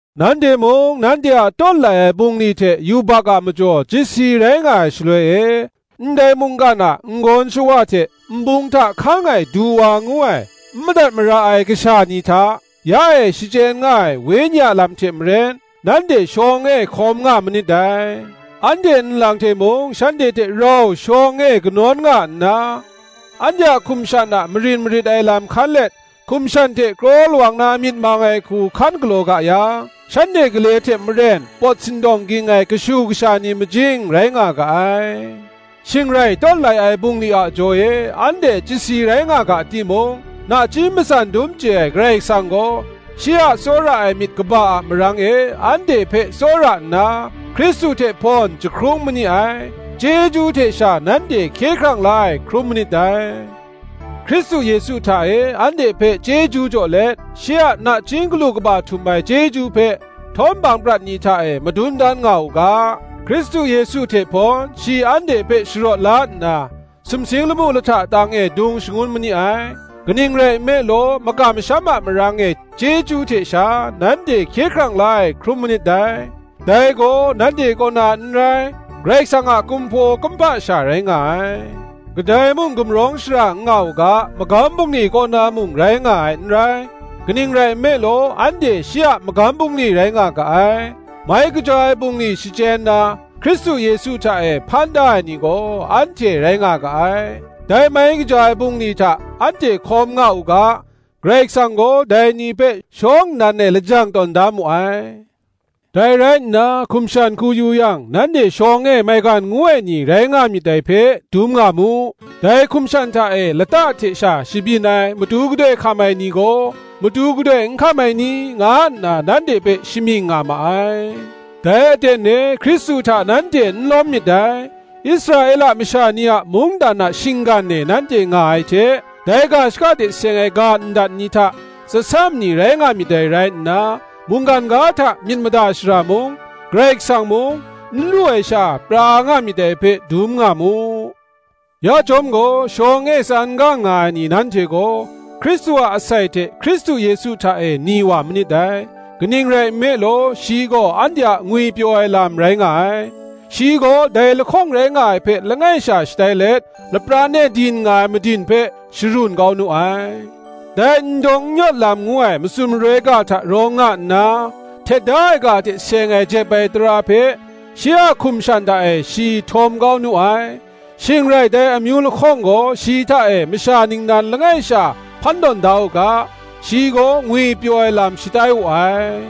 Nanhte mung, nanhte a tawt lai ai bungli hte yubak a majaw chyasi rai nga ai shaloi e, ndai mungkan a n-gawn shawa hte, nbung hta hkang ai du wa ngu ai, n madat mara ai kasha ni hta, ya e shachyen nga ai wenyi a lam hte maren, nanhte shawng e hkawm nga manit dai. Anhte nlang hte mung shanhte hte rau shawng e kanawn nga nna, anhte a hkum shan a marin marit ai lam hkan let, hkum shan hte kraw lawang na myit mang ai hku hkan galaw ga yang, shanhte gale hte maren pawt sindawng ging ai kashu kasha ni majing rai nga ga ai. Shing rai, tawt lai ai bungli a jaw e, anhte chyasi rai nga ga timung, nachying matsan dum chye ai Karai Kasang gaw, shi a tsawra ai myit kaba a marang e anhte hpe tsawra nna, Hkristu hte hpawn jahkrung ma ni ai; chyeju hte sha nanhte hkye hkrang la ai hkrum manit dai; Hkristu Yesu hta e anhte hpe chyeju jaw let, shi a nachying galu kaba htum ai chyeju hpe htawm hpang prat ni hta e madun dan nga u ga, Hkristu Yesu hte hpawn, shi anhte hpe sharawt la nna, sumsing lamu lahta tang e dung shangun ma ni ai. Kaning rai nme law, makam masham a marang e, chyeju hte sha, nanhte hkye hkrang la ai hkrum manit dai: dai gaw nanhte kaw na n rai, Karai Kasang a kumhpaw kumhpa sha rai nga ai: kadai mung gumrawng shara n nga u ga, magam bungli kaw na mung rai nga ai n rai. Kaning rai nme law, anhte shi a magam bungli rai nga ga ai; mai kaja ai bungli shachyen na, Hkristu Yesu hta e hpan da ai ni gaw, anhte rai nga ga ai: dai mai kaja ai bungli hta anhte hkawm nga u ga, Karai Kasang gaw dai ni hpe shawng nnan e lajang tawn da mu ai. Dai rai nna, hkum shan hku yu yang, nanhte shawng e maigan ngu ai ni rai nga myit dai hpe, dum ngu mu; dai hkum shan hta e lata hte sha shabyin ai matu gadoi hkam ai ni gaw, Matu gadoi n hkam ai ni, nga nna nanhte hpe shamying nga ma ai; dai aten e Hkristu hta nanhte n lawm myit dai; Israela masha ni a mungdan a shinggan e nanhte nga ai hte, dai ga shaka hte seng ai ga ndat ni hta tsasam ni rai nga myit dai rai nna, mungkan ga hta myit mada shara mung, Karai Kasang mung, n lu ai sha pra nga myit dai hpe, dum nga mu. Ya chyawm gaw, shawng e tsan gang nga ai ni nanhte gaw, Hkristu a asai hte Hkristu Yesu hta e ni wa manit dai. Kaning rai nme law, shi gaw anhte a ngwipyaw ai lam rai nga ai; shi gaw, dai lahkawng rai nga ai hpe langai sha shatai let, lapran e din nga ai madin hpe sharun kau nu ai; dai n dawng n yawt lam ngu ai matsun maroi ga hta rawng nga nna, htet da ai ga hte seng ai jep ai tara hpe, shi a hkum shan hta e shi htawm kau nu ai; shing rai, dai amyu lahkawng gaw shi hta e masha ningnan langai sha hpan tawn da u ga, shi gaw ngwipyaw ai lam shatai wu ai: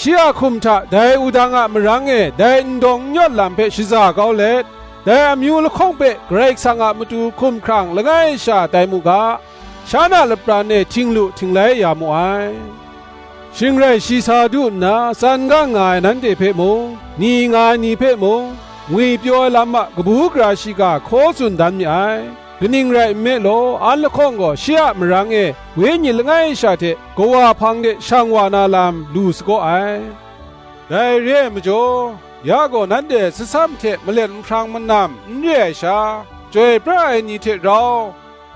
shi a hkum hta dai wudang a marang e, dai n dawng n yawt lam hpe shaza kau let, dai amyu lahkawng hpe Karai Kasang a matu hkumhkrang langai sha tai mu ga, shan a lapran e htinglu htinglai ya mu ai. Shing rai shi sa du nna, tsan gang nga ai nanhte hpe mung, ni nga ai ni hpe mung, ngwipyaw ai lam a kabu gara shiga hkaw tsun dan mi ai. Kaning rai nme law, an lahkawng gaw shi a marang e, Wenyi langai sha hte Kawa hpang de shang wa na lam lu la sagaw ai. Dai re ai majaw, ya gaw nanhte tsasam hte malet nhprang manam n re ai sha, chyoi pra ai ni hte rau,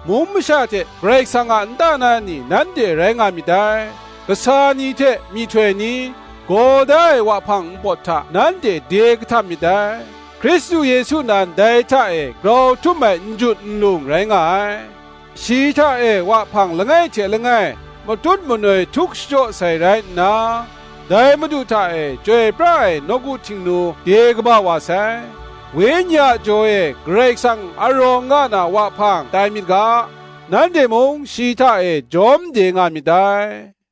mung masha hte Karai Kasang a nta na ni, nanhte rai nga myit dai: kasa ni hte myihtoi ni, gaw da ai wahpang npawt hta nanhte de kahtap myit dai; Hkristu Yesu nan dai hta e grau htum ai njut nlung rai nga ai; shi hta e wahpang langai hte langai, matut manoi htuk shachyaw sai rai nna, dai Madu hta e chyoi pra ai nawku htingnu de kaba wa sai: Wenyi a jaw e Karai Kasang a rawng nga na wahpang tai myit ga, nanhte mung shi hta e jawm de nga myit dai.